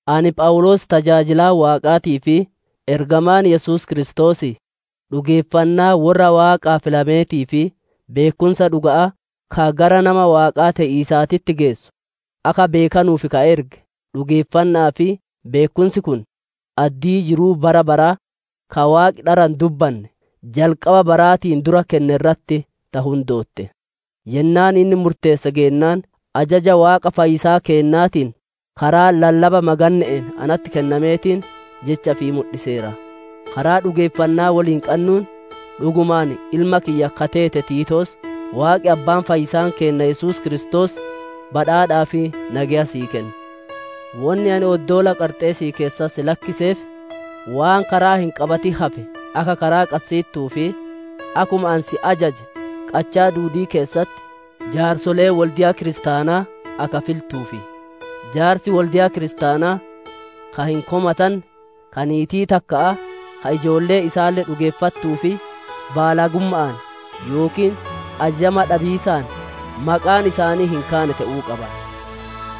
Ani Phawuloos tajaajilaan Waaqaatii fi ergamaan Yesuus Kiristoosii, dhugeeffannaa worra Waaqaa filameetii fi beekkumsa dhuga'aa ka gara nama Waaqaa te'iisaatitti geessu akka beekanuuf ka erge, dhugeeffanna'aa fi beekkumsi kun, addii jiruu bara baraa, ka Waaqi dhara hin dubbanne, jalqaba baraatiin dura kenne irratti ta hundootte. Yennaan inni murteesse geennaan, ajaja Waaqa fayyisaa keennaatiin karaa lallaba maganne'een natti kennameetiin, Jecha ifii mudhiseera. Karaa dhugeeffannaa woliin qannuun, dhugumaan ilma kiyya ka teete Tiitoos, Waaqi Abbaan, fayyisaan keenna Yesuus Kiristoos badhaadhaa fi nageya sii kennu. Wonni ani oddoola Qarxeesii keessatti si lakkiseef, waan karaa hin qabatin hafe akka karaa qassiittuu fi akkuma ani si ajaje qachaa duudii keessatti jaarsolee wolde'a kiristaanaa akka filtuufi. Jaarsi wolde'a kiristaanaa ka hin komatanne, ka niitii takka'aa, ka ijoolleen isaalle dhugeeffattuu fi baalagumma'aan yookiin ajajama dhabiisaan maqaan isaanii hin kaane te'uu qaba.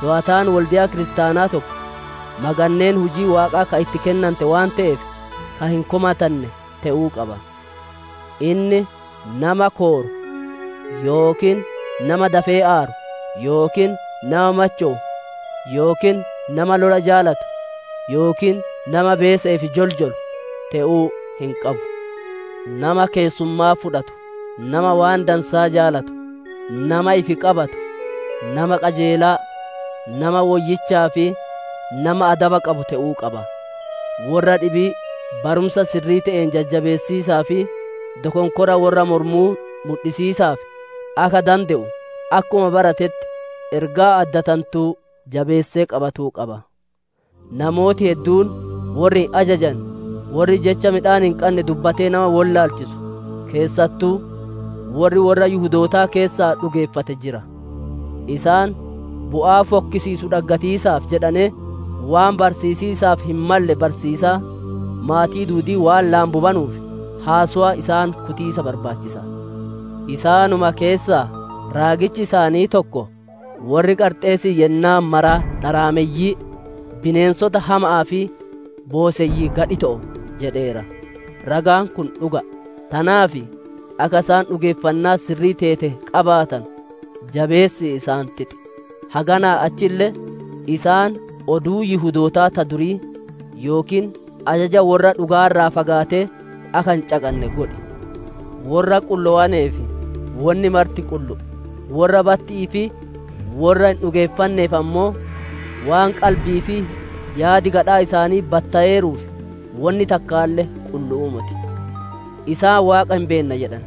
Toowataan wolde'a kiristaanaa tokko maganneen hujii Waaqaa ka itti kennante waan te'eef, ka hin komatanne te'uu qaba. Inni nama kooru, yookiin nama dafee aaru, yookiin nama machowu, yookiin nama lola jaalatu yookiin nama beese'eef joljolu te'uu hin qabu. Nama keessummaa fudhatu, nama waan dansaa jaalatu, nama ifi qabatu, nama qajeelaa, nama woyyichaa fi nama adaba qabu te'uu qaba. Worra dhibii barumsa sirrii te'een jajjabeessiisaa fi dokonkora worra moromuu mudhisiisaaf akka dande'u akkuma baratetti ergaa addatantuu jabeessee qabatuu qaba. Namooti hedduun worri hin ajajane, worri jecha midhaan hin qanne dubbatee nama wollaalchisu, keessattuu worri worra Yihudootaa keessaa dhugeeffate jira. Isaan bu'aa fokkisiisu dhaggatiisaaf jedhanee, waan barsiisiisaaf hin malle barsiisaa, maatii duudii waan laambubanuuf, haasowa isaan kutiisa barbaachisa. Isaanuma keessaa, raagichi isaanii tokkoo, «Worri Qarxeesii yennaa maraa dharaameyyii, bineensota hama'aa fi booseyyii gadhito'o» jedheera. Ragaan kun dhuga'a. Tanaaf, akka isaan dhugeeffannaa sirrii teete qabaatanu, jabeessi isaan xixi; haganaa achille isaan oduu Yihudootaa ta durii, yookiin ajaja worra dhugaa irraa fagaatee akka hin caqanne godhi. Worra qullowaneef wonni marti qullu'u; worra batti'ii fi worra hin dhugeeffanneef ammoo, waan qalbii fi yaadi gadhaa isaanii battoweeruuf, wonni takkaalle qullu'uu moti. Isaan Waaqa hin beenna jedhan,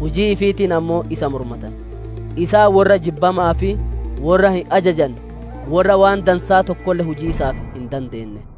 hujii ifiitiin ammoo isa mormatan. Isaan worra jibbama'aa fi worra hin ajajanne, worra waan dansaa tokkolle hujiisaaf hin dandeenne.